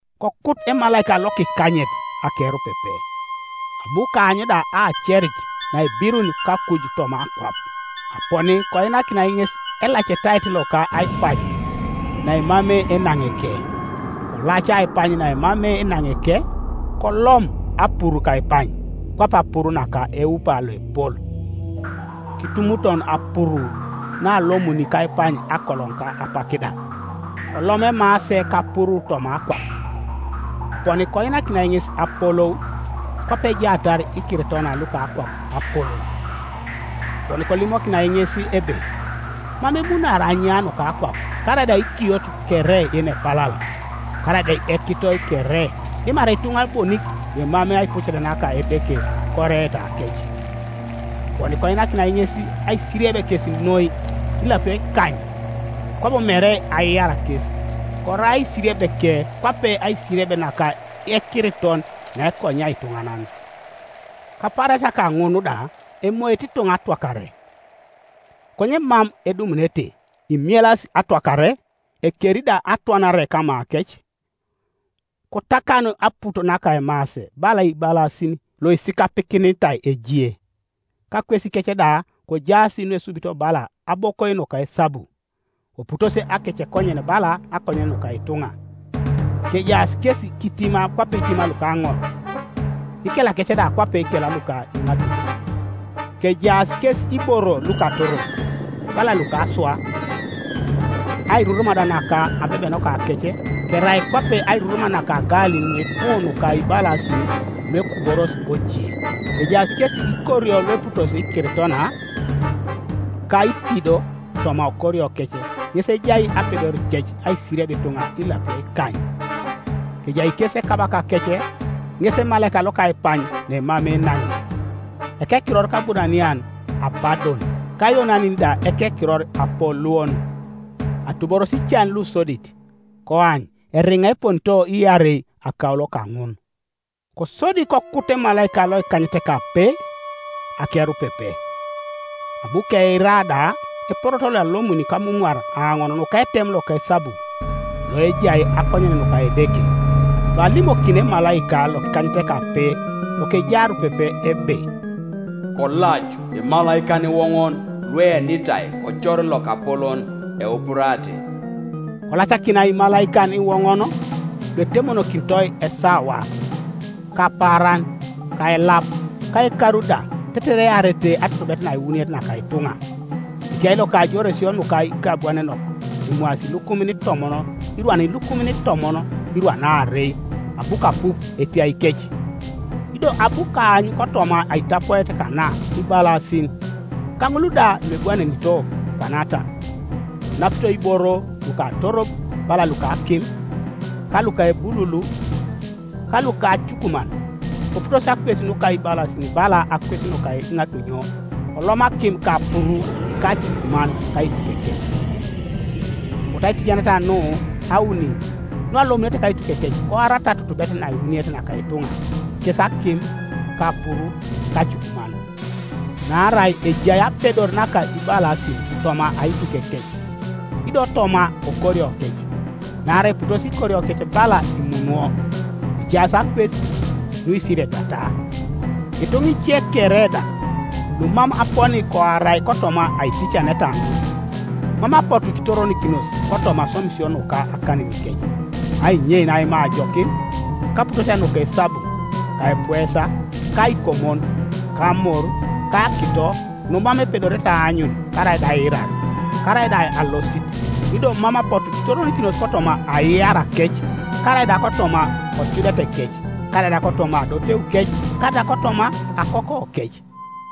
Kokut emalaika lokikanyet akerupepe, abu kaany da aacerit naebirun kakuj toma akwap, aponi koinakinai ŋes elacetait loka aipany naemamei enaŋeke. Kolaca aipany naemamei enaŋeke, kolom apuru kaipany, kwape apuru naka eupa loepol. Kitumuton apuru naalomuni kaipany akoloŋ ka apak da. Kolom emaase kapuru toma akwap, aponi koinakinai ŋes apolou, kwape ejaatar ikiritona luka akwap apolou. Aponi kolimokinai ŋes ebe mam emunaari anya nuka akwap, karaida ikiot kere yenepalal, karaida ekitoi kere, dimarai ituŋa bonik luemamei aipucet naka Edeke koreetakec; aponi koinakinai ŋes aisirieb kes noi, ilapio ikany, kwabo mere aiar kes; korai aisiriebeke kwape aisirieb naka ekiriton naekonyia ituŋanan. Kapaarasia kaŋun da emoete ituŋa atwakare, konye mam edumunete, imielas atwakare, ekeri da atwanare kamakec. Kotakan aput naka emaase bala ibalasin luisikapikinitai ejie, kakwesikec da kojaas nuesubito bala abokoi nuka esabu, koputosi akecekonyen bala akonyen nuka ituŋa. Kejaas kes itima kwape itima luka aŋor, ikelakec da kwape ikel luka iŋatunyo, kejaas kes iboro lukatorob, bala luka aswa, airurum da naka abebenokakec kerai kwape airurum naka agalin nuipu nuka ibalasin luekuboros ojie. Kejaas kes ikorio lueputosi ikiritona, ka itido, toma okoriokec ŋes ejai apedorikec aisirieb ituŋa ilapio ikany. Kejai kes ekabakakec ŋes emalaika loka aipany naemamei enaŋe, ekekiror kAburanian Abadon, ka Ayonanin da ekekiror Apoluon. Atuboros ican lusodit; koany eriŋa eponito iarei akaulo kaŋun. Kosodi kokut emalaika lokikanyetekape akerupepe, abu keira da eporoto loalomuni kamumwar aoŋon nuka etem loka esabu loejai akonyen nuka Edeke, loalimokini emalaika lokikanyetekape, lokejai arupepe ebe, “Kolac imalaikan iwoŋon lueenitai kocor lokapolon Eupurate.” Kolacakinai imalaikan iwoŋon luetemokinitoi esawa, ka apaaran, ka elap, ka ekaru da, tetere earete atutubet nakiwuniet naka ituŋa, Etiai loka ajoresio nuka ikebwanenok emwaasi ilukumin itomon irwan ilukumin itomon irwan aarei; abu kapup etiaikec. Ido abu kaany kotoma aitapoet kana ibalasin, ka ŋul da luebwanenito kwana ta: konapito iboro lukatorob bala luka akim, ka luka ebululu, ka luka acukuman; koputosi akwes nuka ibalasin bala akwes nuka iŋatunyo, kolom akim ka apuru ka acukuman kaitukekec. Apotu aiticaneta nu auni nualomunete kaitukekec koarata atutubet nakiwuniet naka ituŋa, kes akim, ka apuru, ka acukuman. Naarai ejai apedor naka ibalasin toma aitukekec, ido toma okoriokec; naarai eputosi ikoriokec bala imunwo, ejaas akwes, nuisiriebiata. Ituŋa ice kere da, lumam aponi koarai kotoma aiticaneta ŋun, mam apotu kitoronikinos kotoma aswamisio nuka akaninikec, ainyein aima ajokin, ka aputosia nuka esabu, ka epuesa, ka aikomon, ka amor, ka akito, numam epedorete aanyun, karaida aiirar, karaida alosit; ido mam apotu kitoronikinos kotoma aiarakec, karaida kotoma ocudetekec, karai da kotoma adoteukec, karaida kotoma akokokec.